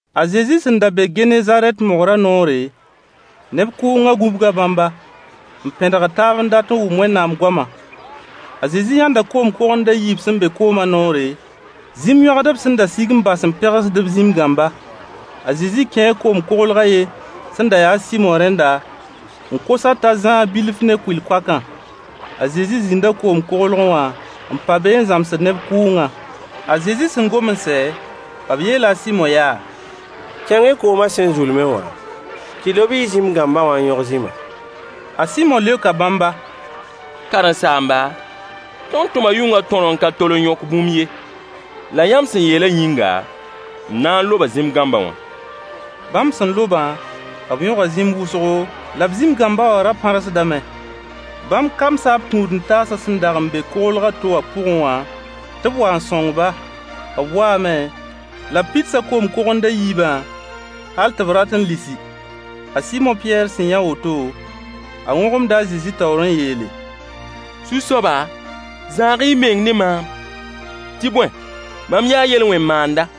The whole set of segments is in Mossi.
A Zezi sẽn da be Genezarɛt mogrã noore, neb kʋʋngã gũbga bãmba, n pẽdgd taab n dat n wʋm Wẽnnaam goamã. A Zezi yãnda koom kogend a yiib sẽn be kooma noore, zĩm-yõagdb sẽn da sig n bas n pegsd b zĩm-gãmba. A Zezi kẽe koglg a yen sẽn da ya a Sɩmo rẽnda, n kos-a t'a zãag bilf ne kʋɩl-koakã. La a Zezi zĩnda koom koglgẽ wã n pa be n zãmsd neb kʋʋngã. A Zezi sẽn gom n sɛ, b yeela a Sɩmo yaa: Kẽng-y kooma sẽn zulmẽ wã, tɩ y lob y zĩm-gãmba wã n yõg zĩma. A Sɩmo leoka bãmba: Karen-saamba, tõnd tʋma yʋngã tõr n ka tol n yõk bũmb ye. La yãmb sẽn yeelã yĩnga, m na n loba zĩm-gãmba wã. Bãmb sẽn lobã, b yõga zĩm wʋsgo, la b zĩm-gãmba wã ra pãrsdame. Bãmb kamsa b tũud-n-taasã sẽn dag n be koglg a to wã pʋgẽ wã tɩ b wa n sõng-ba. B waame la b pidsa koom-kogend a yiibã hal tɩ b rat n lisi. A Sɩmo Pɩyɛɛr sẽn yã woto, a wõgemda a Zezi taoor n yeele: Zu-soaba, zãag-y y meng ne maam. Tɩ bõe, mam yaa yel-wẽn maanda.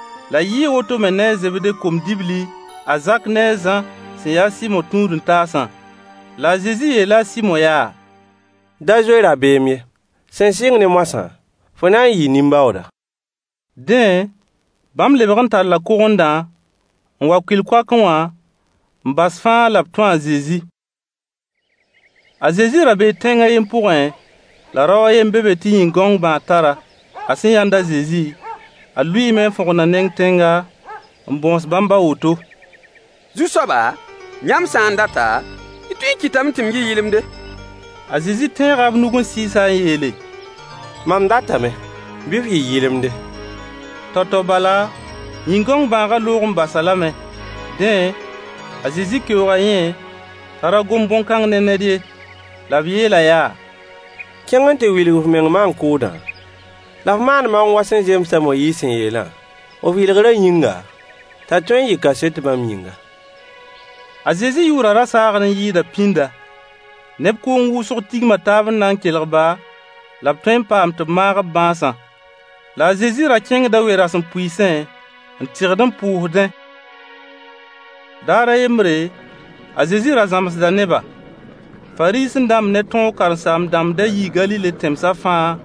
La yɩɩ woto me ne a Zebde kom-dibli a Zak ne a Zã sẽn yaa a Sɩmo tũud-n-taasã. La a Zezi yeela a Sɩmo yaa: Da zoe rabeem ye. Sẽn sɩng ne moasã, fo na n yɩɩ nin-baooda. Dẽ, bãmb lebg n talla kogendã n wa kʋɩl-koakẽ wã, n bas fãa la b tũ a Zezi. A Zezi ra bee tẽng a yen pʋgẽ, la rao a ye n be be tɩ yĩn-gãong bãag tar-a. A sẽn yãnd a Zezi, a lʋɩɩme n fõgen a neng tẽnga, n bõos bãmb a woto: Zu-soaba, yãmb sã n data, y tõee n kɩtame tɩ m yɩ yɩlemde. A Zezi tẽega b nug n sɩɩs-a n yeele: Mam datame. Bɩ f yɩ yɩlemde. Tao-tao bala, yĩn-gãong bãagã loog n bas-a lame. Dẽ, a Zezi keooga yẽ t'a ra gom bõn-kãng ne ned ye. La b yeel-a yaa: Kẽng n tɩ wilg f meng maan-kʋʋdã, la f maan maoong wa sẽn zems a Moyiis sẽn yeelã, f yɩlgrã yĩnga, t'a tõe n yɩ kaset bãmb yĩnga. A Zezi yʋʋrã ra saagd n yɩɩda pĩnda. Neb kʋʋng wʋsg tigma taab n na n kelg-ba, la b tõe n paam tɩ b maag b bãasã. La a Zezi ra kẽngda we-rasempʋɩɩsẽ, n tɩgd n pʋʋsdẽ. Daar a yembre, a Zezi ra zãmsda neba. Fariisẽ-dãmb ne tõog karen-saam-dãmb da yii Galile tẽmsã fãa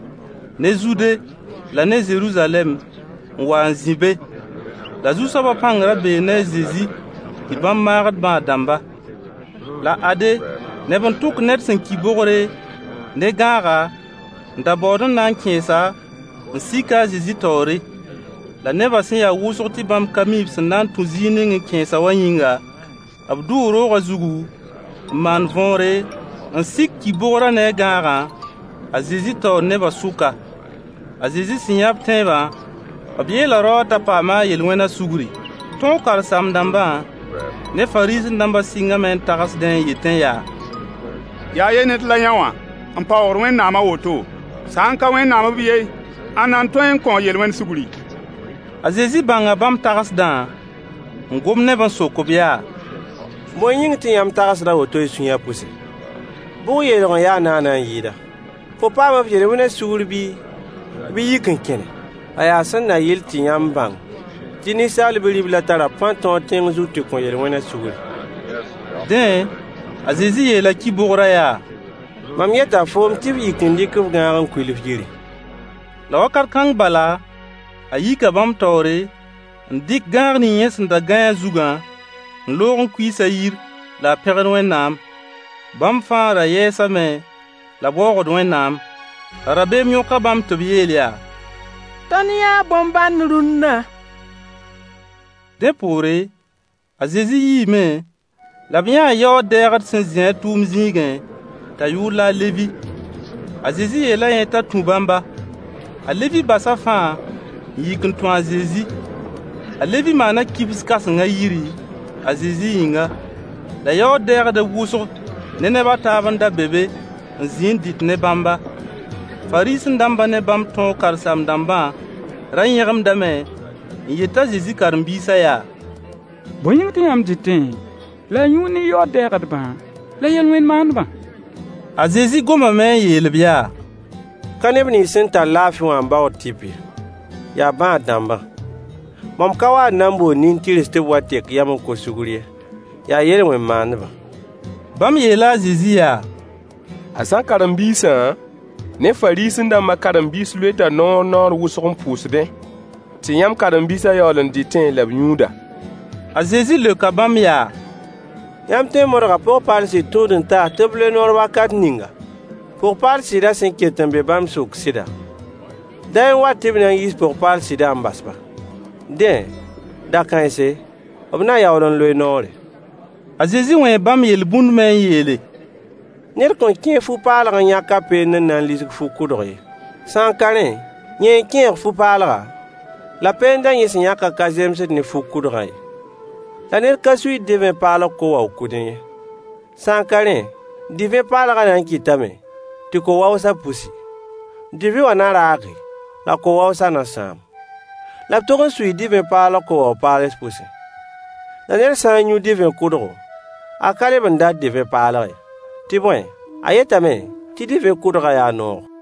ne Zude la ne Zeruzalɛm n wa n zĩ be. La Zu-soaba pãng ra bee ne a Zezi tɩ bãmb maagd bãad-dãmba. La ade, neb n tʋk ned sẽn ki bogre, ne gãaga, n da baood n na n kẽes-a, n sik-a a Zezi taoore. La nebã sẽn ya wʋsg tɩ bãmb ka mi b sẽn na n tũ zĩig ning n kẽes-a wã yĩnga, b dʋʋ roogã zugu, n maan võore, n sik ki-bogrã ne a gãagã a Zezi taoor nebã sʋka. A Zezi sẽn yã b tẽebã, b yeela rao wã t'a paama a yel-wẽna sugri. Tõog karen-saam-dãmbã ne Fariisẽ-dãmbã sɩngame n tagsdẽ n yetẽ yaa: Yaa yɛ ned la yõwã n paoogd Wẽnnaam a woto? Sã n ka Wẽnnaam b yen, ãnna n tõe n kõ yel-wẽn sugri? A Zezi bãnga bãmb tagsdã, n gom ne-b n sok-b yaa: Bõe yĩng tɩ yãmb tagsd a woto y sũyã pʋse? Bʋg yeelg n ya naana n yɩɩda? “Fo paama f yel-wẽna sugr” bii, bɩ “yik n kẽne?” La yaa sẽn na yɩl tɩ yãmb bãng tɩ Ninsaal Bi-riblã tara pãn-tõog tẽng zug tɩ kõ yel-wẽna sugri. Dẽ, a Zezi yeela ki-bogrã yaa: Mam yeta foom tɩ f yik n dɩk f gãag n kuil f yiri. La wakat kãng bala, a yika bãmb taoore, n dɩk gãag ning yẽ sẽn da gãe a zugã, n loog n kuiis a yir la a pẽgd Wẽnnaam. Bãmb fãa ra yɛɛsame, la b waoogd Wẽnnaam. La rabeem yõka bãmb tɩ b yeel yaa: Tõnd yãa bõn-bãnd rũnna. Dẽ poore, a Zezi yiime, la b yãa yaood-dɛɛgd sẽn zĩ a tʋʋm zĩigẽ, t'a yʋʋr la a Levi. A Zezi yeela yẽ t'a tũ bãmba. A Levi basa fãa n yik n tũ a Zezi. A Levi maana kibs kãseng a yiri, a Zezi yĩnga. La yaood-dɛɛgdb wʋsg ne neb a taab n da be be n zĩ n dɩt ne bãmba. Fariisẽ-dãmbã ne bãmb tõog karen-saam-dãmbã ra yẽgemdame n yet a Zezi karen-biisã yaa: Bõe yĩng tɩ yãmb dɩtẽ la y yũud ne yaood-dɛɛgdbã la yel-wẽn maandbã? A Zezi gomame n yeel-b yaa: Ka neb nins sẽn tar laafɩ wã n baood tɩp ye: yaa bãad-dãmbã. Mam ka wa n na n bool nin-tɩrs tɩ b wa tek yam n kos sugr ye, yaa yel-wẽn maandbã. Bãmb yeela a Zezi yaa: A Zã karen-biisã ne Fariisẽ-dãmba karen-biis loeta noor naoor wʋsg n pʋʋsdẽ, tɩ yãmb karen-biisã yaool n dɩtẽ la b yũuda. A Zezi leoka bãmb yaa: Yãmb tõe n modga pʋg-paal sɩd tũud-n-taas tɩ b loe noor wakat ninga pʋg-paal sɩdã sẽn ket n be bãmb sʋk sɩda? Day n wat tɩ b na n yiis pʋg-paal sɩdã n bas-ba. Dẽ, da-kãense, b na yaool n loe noore. A Zezi wẽe bãmb yel-bũnd me n yeele: Ned kõn kẽeg fu-paalg n yãk a peend n na n lisg fu-kʋdg ye. Sã n ka rẽ, yẽ n kẽeg fu-paalga, la peendã yẽ sẽn yãkã ka zemsd ne fu-kʋdgã ye. La ned ka suiid divẽ paalg ko-wao-kʋdẽ ye. Sã n ka rẽ, divẽ paalgã na n kɩtame tɩ ko-waoosã pusi. Divẽ wã na raage, la ko-waoosã na sãam. La b tog n suii divẽ paalg ko-wao-paals pʋse. La ned sã n yũ divẽ kʋdgo, a ka leb n dat divẽ paalg ye. Tɩ bõe, a yetame tɩ divẽ kʋdgã yaa noogo.